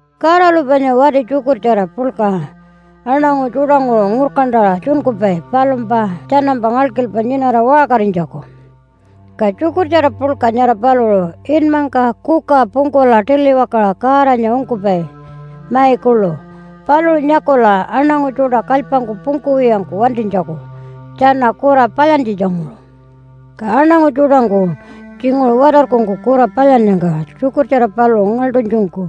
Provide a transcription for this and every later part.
Godalu panya wati tjukurtjara puḻka aṉangu tjuṯanguṟu ngurkantaṟa tjunkupai palumpa tjanampa ngalkilpa nyinara waṟkarinytjaku. Ka tjukurtjara puḻka nyara paluṟu inmangka kuka pungkula tiliwakaṟa Godanya ungkupai mai kuḻu, paluṟu nyakula aṉangu tjuṯa kalypangku pungkuwiyangku wantinytjaku tjana kura palyantjitjanguṟu. Ka aṉangu tjuṯangku tjinguṟu watarkungku kura palyannyangka tjukurtjara paluṟu ngaḻṯunytjungku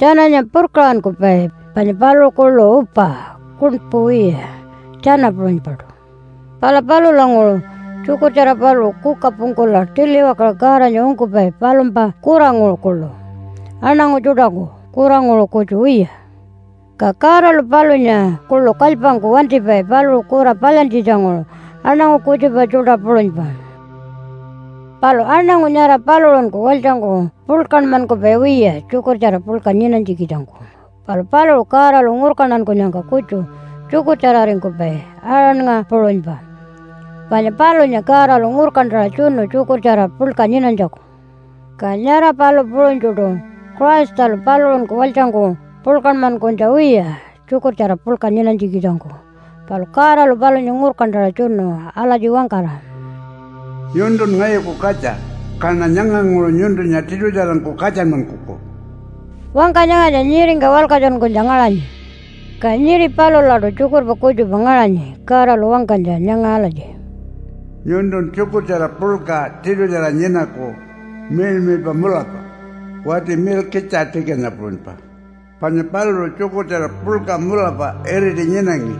tjananya purkaṟankupai, panya paluṟu kuḻu upa kuṉpu wiya tjana puṟunypaṯu. Pala palulanguṟu tjukurtjara paluṟu kuka pungkula tiliwakaṟa Godanya ungkupai palumpa kuranguṟu kuḻu aṉangu tjuṯaku kuranguṟu kutju wiya, ka Godalu palunya kuḻu kalypangku wantipai paluṟu kura palyantjitjanguṟu aṉangu kutjupa tjuṯa puṟunypa. Palu aṉangu nyara paluṟunku walytjangku puḻkanmankupai wiya tjukurtjara puḻka nyinanytjikitjangku, palu paluṟu Godalu ngurkantankunyangka kutju tjukurtjararingkupai, Aaronnga puṟunypa, panya palunya Godalu ngurkantaṟa tjunu tjukurtjara puḻka nyinanytjaku. Ka nyara palu puṟunytjuṯu Christalu paluṟunku walytjangku puḻkanmankunytja wiya tjukurtjara puḻka nyinanytjikitjangku. Palu Godalu palunya ngurkantaṟa tjunu alatji wangkara, “Nyuntun ngayuku katja, kaṉa nyanganguṟu nyuntunya tiṯutjarangku katjanmankuku.” Wangka nyangatja nyiringka walkatjunkunytja ngaṟanyi. Ka nyiri palulaṯu tjukurpa kutjupa ngaṟanyi Godalu wangkanytja nyanga alatji, “Nyuntun tjukurtjara puḻka tiṯutjara nyinaku miḻmiḻpa mulapa, wati Milkitja-tikanya puṟunypa, panya paluṟu tjukurtjara puḻka mulapa iriti nyinangi,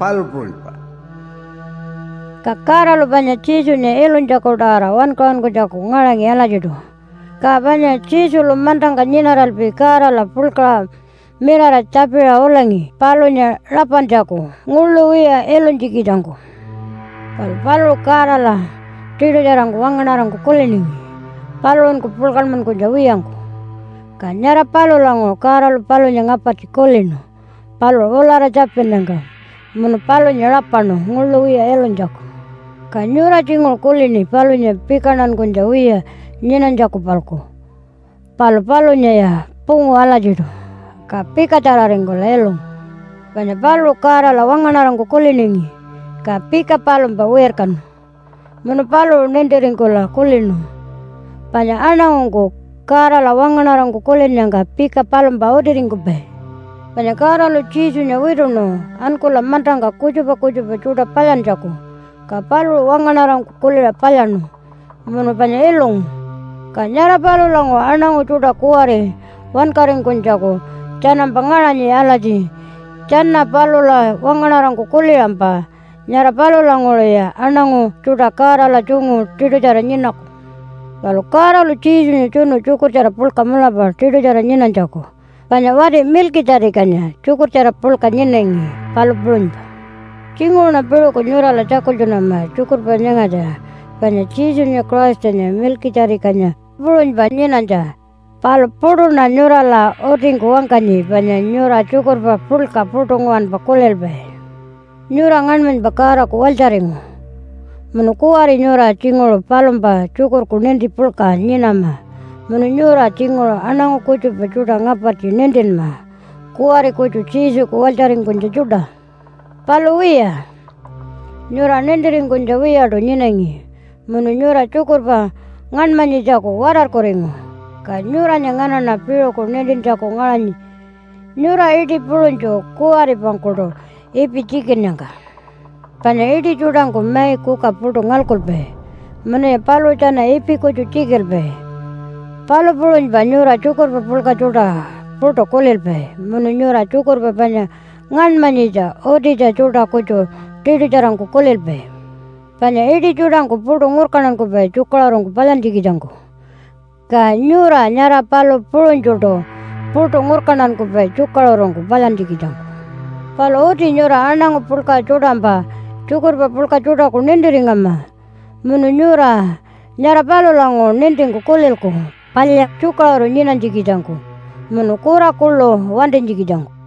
palu puṟunypa.” Ka Godalu panya Jesunya ilunytjaku-tawara wankaṟunkunytjaku ngaṟangi alatjiṯu. Ka panya Jesulu mantangka nyinaralpi Godala puḻkaṟa mirara tjapiṟa ulangi palunya rapantjaku nguḻu wiya ilunytjikitjangku. Palu paluṟu Godala tiṯutjarangku wangaṉarangku kuliningi paluṟunku puḻkanmankunytja wiyangku, ka nyara palulanguṟu Godalu palunya ngapartji kulinu paluṟu ulara tjapinnyangka, munu palunya rapaṉu nguḻu wiya ilunytjaku. Ka nyura tjinguṟu kulini palunya pikantankunytja wiya nyinanytjaku-palku. Palu palunyaya pungu alatjiṯu, ka pikatjararingkula ilungu. Panya paluṟu Godala wangaṉarangku kuliningi ka pika palumpa wirkanu. Munu paluṟu nintiringkula kulinu panya aṉangungku Godala wangaṉarangku kulinnyangka pika palumpa utiringkupai. Panya Godalu Jesunya wituṉu ankula mantangka kutjupa kutjupa tjuṯa palyantjaku. Ka paluṟu wangaṉarangku kuliṟa palyaṉu munu panya ilungu, ka nyara palulanguṟu aṉangu tjuṯa kuwari wankaringkunytjaku tjanampa ngaṟanyi alatji, tjana palula wangaṉarangku kuliṟampa. Nyara palulanguṟuya aṉangu tjuṯa Godala tjungu tiṯutjara nyinaku. Palu Godalu Jesunya tjunu tjukurtjara puḻka mulapa tiṯutjara nyinanytjaku, panya wati Milkitja-tikanya tjukurtjara puḻka nyinangi, palu puṟunypa. Tjinguṟuṉa piṟuku nyurala tjakultjunama tjukurpa nyangatja panya Jesunya Christanya Milkitja-tikanya puṟunypa nyinanytja. Palu puṯuṉa nyurala utingku wangkanyi panya nyura tjukurpa puḻka puṯu nguwanpa kulilpai. Nyura ngaṉmanypa Godaku walytjaringu munu kuwari nyura tjinguṟu palumpa tjukurku ninti puḻka nyinama munu nyura tjinguṟu aṉangu kutjupa tjuṯa ngapartji nintinma kuwari kutju Jesuku walytjaringkunytja tjuṯa. Palu wiya, nyura nintiringkunytja wiyaṯu nyinangi munu nyura tjukurpa ngaṉmanyitjaku watarkuringu, ka nyuranya nganaṉa piṟuku nintintjaku ngaṟanyi, nyura iṯi puṟunytju kuwaripangkuṯu ipi tjikinnyangka. Panya iṯi tjuṯangku mai kuka puṯu ngalkupai munuya paluṟu tjana ipi kutju tjikilpai, palu puṟunypa nyura tjukurpa puḻka tjuṯa puṯu kulilpai, munu nyura tjukurpa panya ngaṉmanyitja utitja tjuṯa kutju tiṯutjarangku kulilpai. Panya iṯi tjuṯangku puṯu ngurkantankupai tjukaṟurungku palyantjikitjangku. Ka nyura nyara palu puṟunytjuṯu puṯu ngurkantankupai tjukaṟurungku palyantjikitjangku. Palu uti nyura aṉangu puḻka tjuṯampa tjukurpa puḻka tjuṯaku nintiringama. Munu nyura nyara palulanguṟu nintingku kulilku palya tjukaṟuru nyinanytjikitjangku munu kura kuḻu wantinytjikitjangku.